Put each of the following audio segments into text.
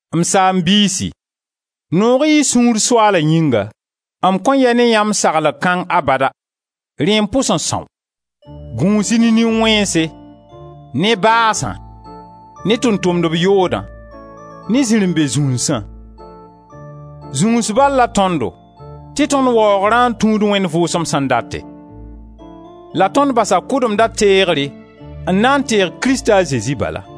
M saam-biisi, noog-y y sũur Soaala yĩnga; m kõn yɛ ne yãmb saglg kãng abada! Rẽ n pʋs n são. Gũus-y ne nin-wẽnse, ne baasã, ne tʋʋm-tʋmdb yoodã, ne zirẽ-be-zũnsã. Zũns bal la tõndo tɩ tõnd waoogra n tũud Wẽnd Vʋʋsem sẽn date. La tõnd basa kʋdemdã teegre n na n teeg Krista a Zezi bala.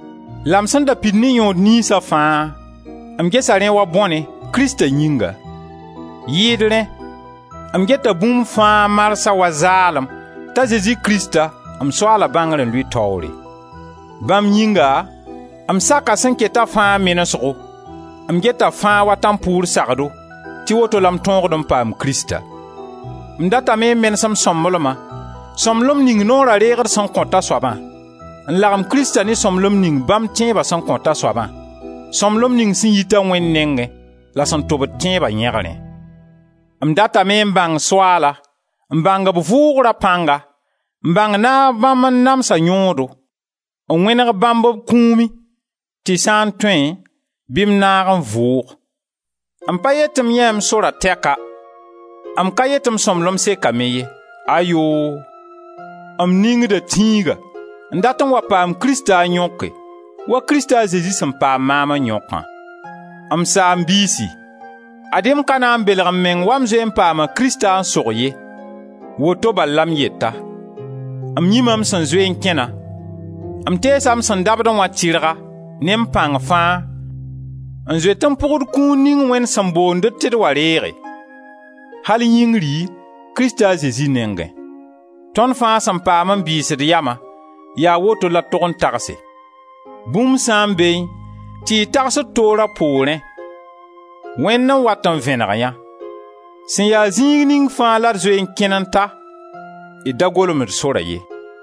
La m sẽn da pid ne yõod niynsa fãa, m gesa rẽ wa bõne, Krista yĩnga. Yɩɩd rẽ, m geta bũmb fãa marsã wa zaalem t'a Zezi Krista, m Soaala, bãngr n lʋɩ taoore. Bãmb yĩnga m saka sẽn keta fãa menesgo, m geta fãa wa tãmpʋʋr sagdo tɩ woto la m tõogd n paam Krista. M datame n menes m sõmblema, sõmblem ning Noora reegr sẽn kõt a soabã, n lagem Krista ne sõmblem ning bãmb tẽeba sẽn kõt a soabã, sõmblem ning sẽn yita Wẽnd nengẽ la sẽn tobd tẽeba yẽgrẽ. M datame n bãng Soaala, n bãng b vʋʋgra pãnga, n bãng naag bãmb n namsa yõodo, n wẽneg bãmb b kũumẽ, tɩ sã n tõe bɩ m naag n vʋʋg. M pa yet tɩ m yãee m sora tɛka, m ka yet tɩ m sõmblem sekame ye, ayoo! M ningda tĩiga n dat n wa paam Krista n yõke wa Krista Zezi sẽn paam maam n yõkã. M saam-biisi, ad-y m ka na n belg m meng wa m zoe n paama Krista n sog ye. Woto bal la m yeta: m yĩma m sẽn zoe n kẽna, m teesa m sẽn dabdẽ wã tɩrga, ne m pãng fãa, n zoet n pʋgd kũun ning Wẽnd sẽn boond-d tɩ d wa reege, al yĩngri, Krista a Zezi nengẽ. Tõnd fãa sẽn paam n bɩɩs d yama, yaa woto la d tog n tagse. Bũmb sã n beẽ tɩ y tagsd toor a poorẽ, Wẽnd n wat n vẽneg yã. Sẽn ya zĩig ning fãa la d zoe n kẽn n ta, d da golem d sora ye.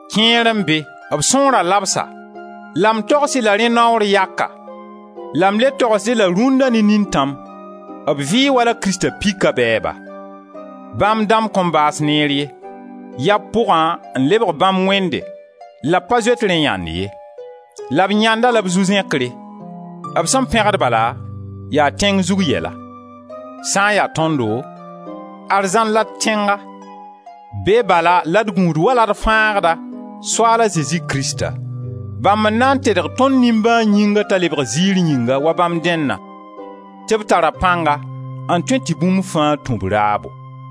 Kẽer n be, b sõora labsa, la m togs-y la rẽ naoor yaka, la m le togsd-y la rũnna ne nintãm, b vɩɩ wala Krista pika bɛɛba. Bãmb dãmb kõn baas neer ye; yaa b pʋgã n lebg bãmb wẽnde la b pa zoet rẽ yãnd ye; la b yãnda la b zu-zẽkre: b sẽn pẽgd bala yaa tẽng zug yɛla. Sã n ya tõndo, arzãn la d tẽnga: be bala la d gũud wala d Fãagda, Soaal a Zezi Krista. Bãmb n na n tedg tõnd nimbãan yĩngã t'a lebg ziir yĩnga wa bãmb dẽnna, tɩ b tara pãnga n tõe tɩ bũmb fãa tũ b raabo.